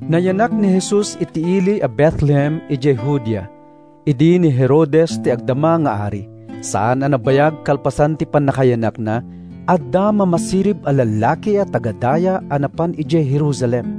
Nayanak ni Jesus iti ili a Betlehem idiay Judea, idi ni Herodes ti agdama nga ari. Saan a nabayag kalpasan ti pannakayanakna, adda mamasirib a lallaki a taga-daya a napan idiay Jerusalem.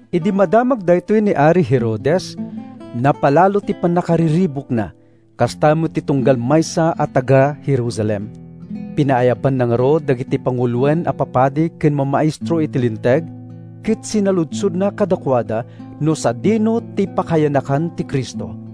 Idi madamag daytoy ni ari Herodes, napalalo ti pannakariribukna, kasta met ti tunggal maysa a taga-Jerusalem. Pinaayabanna ngarud dagiti panguloen a papadi ken mamaestro iti Linteg ket sinaludsodna kadakuada no sadino ti pakayanakan ti Cristo.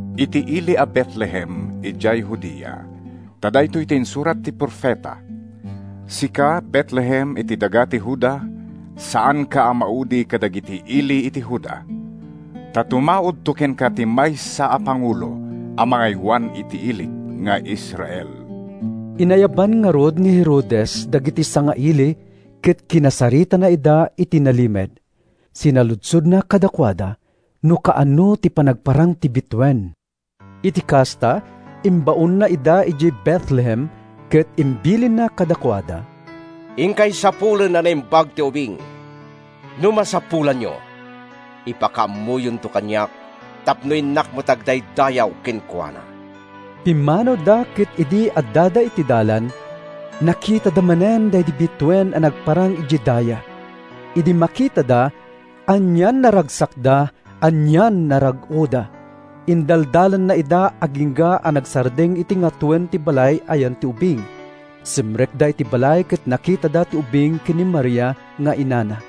“Iti ili a Betlehem idiay Judea,” insungbatda, “ta daytoy ti insurat ti profeta: ‘Sika, Betlehem, iti daga ti Juda, Saanka a maudi kadagiti ili iti Juda; Ta tumaudto kenka ti maysa a pangulo A mangaywan iti ilik nga Israel.’” Inayaban ngarud ni Herodes dagiti sangaili ket kinasaritana ida iti nalimed. Sinaludsodna kadakuada no kaano ti panagparang ti bituen. Iti kasta, imbaonna ida idiay Betlehem ket imbilinna kadakuada, “Inkay sapulen a naimbag ti ubing; no masapulanyo, ipakaammoyonto kaniak tapno innak met agdaydayaw kenkuana.” Pimmanawda ket idi addada iti dalan, nakitada manen daydi bituen a nagparang idiay daya. Idi makitada, anian a ragsakda, anian a rag-oda! Indaldalanna ida agingga a nagsardeng iti ngatoen ti balay a yan ti ubing. Simrekda iti balay ket nakitada ti ubing ken ni Maria nga inana.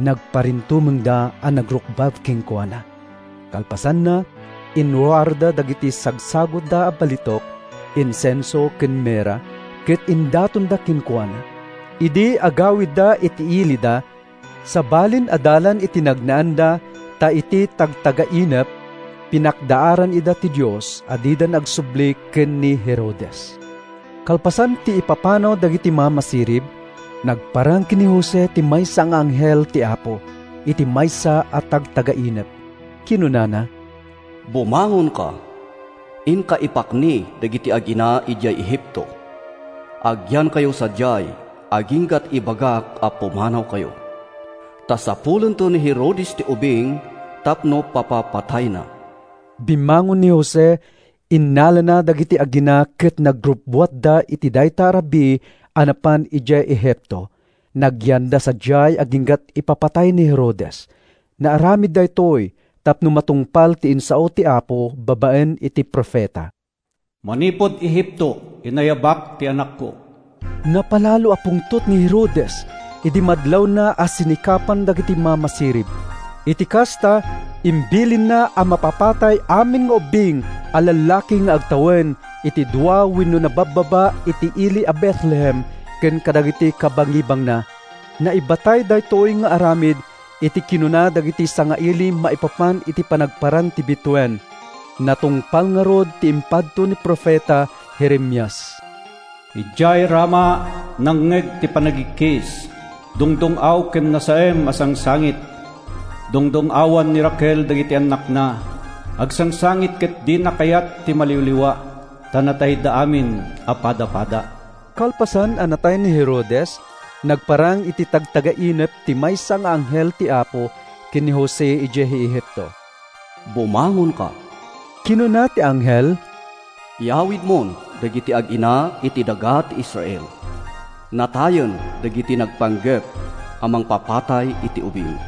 Nagparintumengda a nagrukbab kenkuana. Kalpasanna, inruarda dagiti sagsagutda a balitok, insenso ken mirra ket indatonda kenkuana. Idi agawidda iti ilida, sabalin a dalan ti nagnaanda ta iti tagtagainep, pinakdaaran ida ti Dios a didan agsubli ken ni Herodes. Kalpasan ti ipapanaw dagiti mamasirib, nagparang ken ni Jose ti maysa nga anghel ti Apo, iti maysa a tagtagainep. Kinunana, “Bumangonka; inka ipakni dagiti agina idiay Egipto. Agyankayo sadiay agingga’t ibagak a pumanawkayo. Ta sapulento ni Herodes ti ubing tapno papapatayna.” Bimmangon ni Jose, innalana dagiti agina ket nagrubbuatda iti dayta a rabii a napan idiay Egipto. Nagyanda sadiay agingga’t ipapatay ni Herodes. Naaramid daytoy tapno matungpal ti insao ti Apo babaen iti profeta, “Manipud Egipto inayabak ti anakko.” Napalalo a pungtot ni Herodes idi madlawna a sinikapan dagiti mamasirib. Iti kasta, imbilinna a mapapatay amin nga ubbing a lallaki nga agtawen iti dua wenno nababbaba iti ili a Betlehem ken kadagiti kabangibangna. Naibatay daytoy nga aramid iti kinuna dagiti sangaili maipapan iti panagparang ti bituen. Natungpal ngarud ti impadto ni profeta Jeremias: “Idiay Rama, nangngeg ti panagikkis, Dungdung-aw ken nasaem a sangsangit; Dungdung-awan ni Raquel dagiti annakna, Agsangsangit ket dina kayat ti maliwliwa, Ta natayda amin a padapada.” Kalpasan a natay ni Herodes, nagparang iti tagtagainep ti maysa nga anghel ti Apo ken ni Jose idiay Egipto. “Bumangonka,” kinuna ti anghel. “Yawidmon dagiti agina iti daga ti Israel. Natayen dagiti nagpanggep a mangpapatay iti ubing.”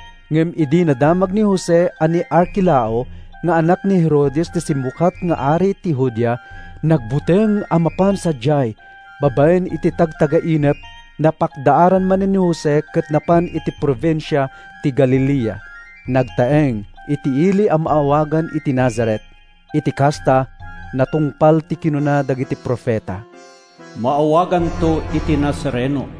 Ngem idi nadamag ni Jose a ni Arkelao nga anak ni Herodes ti simmukat nga ari ti Judea, nagbuteng a mapan sadiay. Babaen iti tagtagainep, napakdaaran manen ni Jose ket napan iti probinsia ti Galilea. Nagtaeng iti ili a maawagan iti Nazaret. Iti kasta, natungpal ti kinuna dagiti profeta, “Maawaganto iti Nazareno.”